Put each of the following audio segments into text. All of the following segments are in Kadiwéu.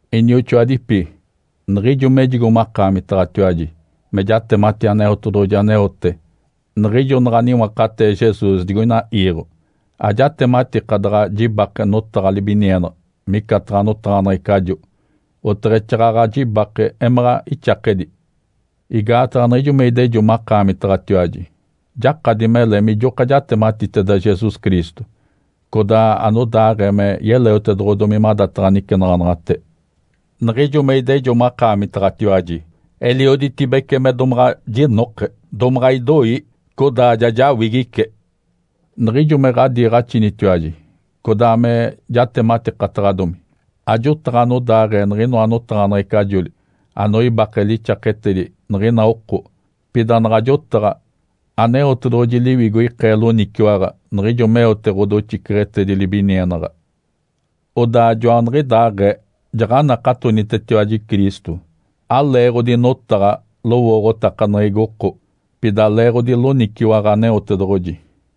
Inioxoadipi, niɡ̶ijo mejigo makaamitaɡ̶atiwaji me jatemati Aneotedoɡ̶oji aneote niɡ̶ijo naɡ̶a niwakatee Jesus digoina iiɡ̶o, ajatematika daɡ̶a jibake notaɡ̶a libinienaɡ̶a micataɡ̶a notaɡ̶aneɡ̶ecajo, oteɡ̶exaaɡ̶aɡ̶a jibake emaɡ̶a ixakedi. Igaataɡ̶a niɡ̶ijo me idejo makaamitaɡ̶atiwaji, jakadi mele mijoka jatematiteda Jesus Cristo codaa anodaaɡ̶ee me yeleotedoɡ̶odomi madataɡ̶a nicenaɡ̶anaɡ̶ate. Niɡ̶ijo me idejo makaamitaɡ̶atiwaji elioditibece me domaɡ̶a jinoke, domaɡ̶a idoi, codaa ja jawigice. Niɡ̶ijo me ɡ̶adiiɡ̶axinitiwaji codaa me jatematikataɡ̶adomi, ajotaɡ̶a anodaaɡ̶ee niɡ̶inoa notaɡ̶aneɡ̶ecajoli anoibake lixaketedi niɡ̶ina oko. Pida naɡ̶a jotaɡ̶a, Aneotedoɡ̶oji Liwigo ikee loniciwaɡ̶a niɡ̶ijo meote ɡ̶odoxiceɡ̶etedi libinienaɡ̶a. Odaa joaniɡ̶idaaɡ̶ee, jaɡ̶anakatonitetiwaji Cristo, aleeɡ̶odi notaɡ̶a lowooɡ̶otakaneɡ̶egi oko, pida leeɡ̶odi loniciwaɡ̶a Aneotedoɡ̶oji.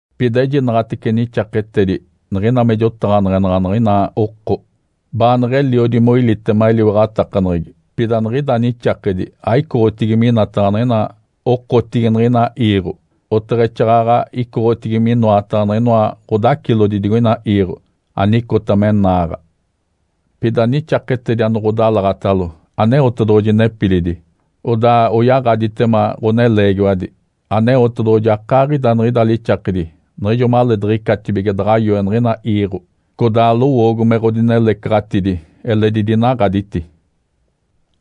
Pida ejinaɡ̶atece nixaketedi niɡ̶ina me jotaɡ̶aneɡ̶enaɡ̶a niɡ̶ina oko baaneɡ̶eliodi moilitema eliwaɡ̶atakaneɡ̶egi. Pida niɡ̶ida nixakedi aicoɡ̶otigi minataɡ̶a niɡ̶ina okotigi niɡ̶ina iiɡ̶o, oteɡ̶exaaɡ̶aɡ̶a icoɡ̶otigi minoataɡ̶a niɡ̶inoa ɡ̶odacilodi digoina iiɡ̶o, anicota me naaɡ̶a. Pida nixaketedi ane ɡ̶odalaɡ̶atalo Aneotedoɡ̶oji nepilidi, odaa oyaɡ̶aditema ɡ̶oneleegiwadi. Aneotedoɡ̶oji akaaɡ̶ida niɡ̶ida lixakedi niɡ̶ijo maleediɡ̶icatibige daɡ̶a yoe niɡ̶ina iiɡ̶o. Codaa lowoogo me ɡ̶odinelecaɡ̶atidi eledi dinaɡ̶aditi.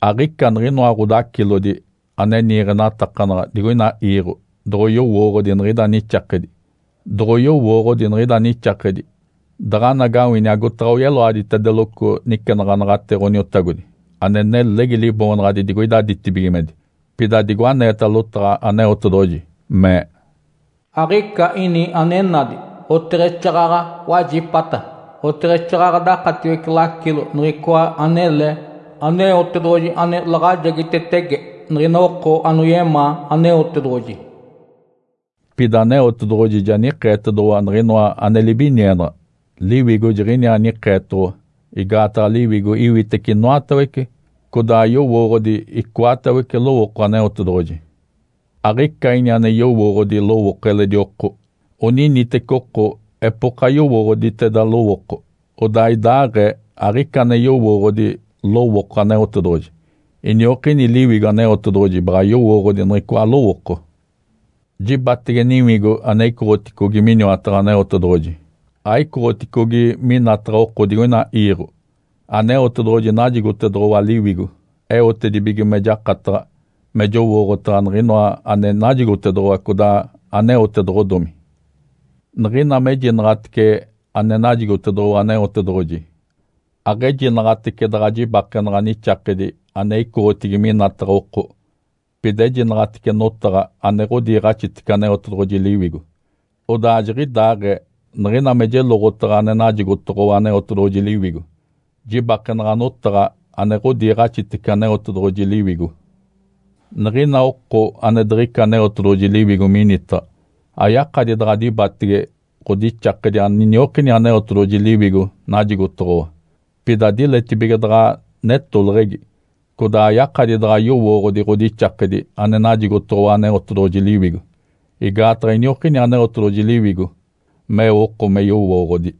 Aɡ̶ica niɡ̶inoa ɡ̶odacilodi ane niiɡ̶enatakanaɡ̶a digoina iiɡ̶o doɡ̶oyowooɡ̶odi niɡ̶ida nixakedi. Doɡ̶oyowooɡ̶odi niɡ̶ida nixakedi, daɡ̶anagawini agotaɡ̶a oyeloaditedeloco nicenaɡ̶anaɡ̶ate Ǥoniotagodi ane nelegi Liboonaɡ̶adi digoida ditibigimedi. Pida digo aneeta lotaɡ̶a Aneotedoɡ̶oji mee, “Aɡ̶ica ini ane nadi, oteɡ̶exaaɡ̶aɡ̶a wajipata, oteɡ̶exaaɡ̶aɡ̶a dakatiwece lacilo niɡ̶icoa anele Aneotedoɡ̶oji ane laɡ̶ajegitetege niɡ̶ina oko anoyemaa Aneotedoɡ̶oji.” Pida Aneotedoɡ̶oji ja nikeetedoɡ̶owa niɡ̶inoa ane libinienaɡ̶a, Liwigo jiɡ̶iniaa nikeetoɡ̶owa. Igaataɡ̶a Liwigo iwitece inoatawece, codaa yowooɡ̶odi icoatawece lowooko Aneotedoɡ̶oji. Aɡ̶ica ini ane yowooɡ̶odi lowooko eledi oko, oniniteci oko epoka yowooɡ̶oditeda lowooko. Odaa idaaɡ̶ee aɡ̶ica ane yowooɡ̶odi lowooko Aneotedoɡ̶oji, iniokini Liwigo Aneotedoɡ̶oji baɡ̶a yowooɡ̶odi niɡ̶icoa lowooko. Jibaɡ̶atege Niwigo ane icoɡ̶oticogi miniwataɡ̶a Aneotedoɡ̶oji, aicoɡ̶oticogi minataɡ̶a oko digoina iiɡ̶o. Aneotedoɡ̶oji najigotedoɡ̶owa Liwigo eotedibige me jakataɡ̶a me jowooɡ̶otaɡ̶a niɡ̶inoa ane najigotedoɡ̶owa codaa aneotedoɡ̶odomi. Niɡ̶ina mejinaɡ̶atece ane najigotedoɡ̶owa Aneotedoɡ̶oji, aɡ̶ejinaɡ̶atece daɡ̶a jibakenaɡ̶a nixakedi ane icoɡ̶otigi minataɡ̶a oko, pida ejinaɡ̶atece notaɡ̶a ane ɡ̶odiiɡ̶axitece Aneotedoɡ̶oji Liwigo. Odaa jiɡ̶idaaɡ̶ee niɡ̶ina me jeloɡ̶otaɡ̶a ane najigotoɡ̶owa Aneotedoɡ̶oji Liwigo, jibakenaɡ̶a notaɡ̶a ane ɡ̶odiiɡ̶axitece Aneotedoɡ̶oji Liwigo. Niɡ̶ina oko ane diɡ̶ica Aneotedoɡ̶oji Liwigo minitaɡ̶a ayakadi daɡ̶a dibatege ɡ̶odixakedi aniniokini Aneotedoɡ̶oji Liwigo najigotoɡ̶owa. Pida diletibige daɡ̶a netoleɡ̶egi. Codaa ayakadi daɡ̶a yowooɡ̶odi ɡ̶odixakedi ane najigotoɡ̶owa Aneotedoɡ̶oji Liwigo, igaataɡ̶a iniokini Aneotedoɡ̶oji Liwigo meo oko me yowooɡ̶odi.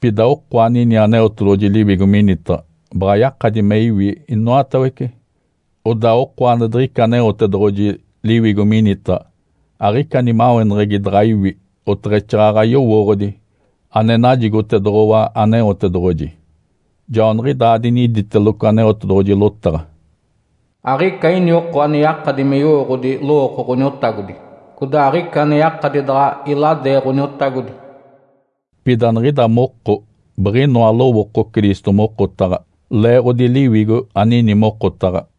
Pida oko anini Aneotedoɡ̶oji Liwigo minitaɡ̶a baɡ̶a yakadi me iwi inoatawece, odaa oko ane diɡ̶ica Aneotedoɡ̶oji Liwigo minitaɡ̶a aɡ̶ica nimaweneɡ̶egi daɡ̶a iwi oteɡ̶exaaɡ̶aɡ̶a yowooɡ̶odi ane najigotedoɡ̶owa Aneotedoɡ̶oji. Joaniɡ̶idaa diniditeloco Aneotedoɡ̶oji lotaɡ̶a, “Aɡ̶ica ini oko ane yakadi me yowooɡ̶odi lowooko Ǥoniotagodi, codaa aɡ̶ica ane yakadi daɡ̶a iladee Ǥoniotagodi.” Pida niɡ̶ida moko biɡ̶inoa lowooko Cristo mokotaɡ̶a, leeɡ̶odi Liwigo anini mokotaɡ̶a.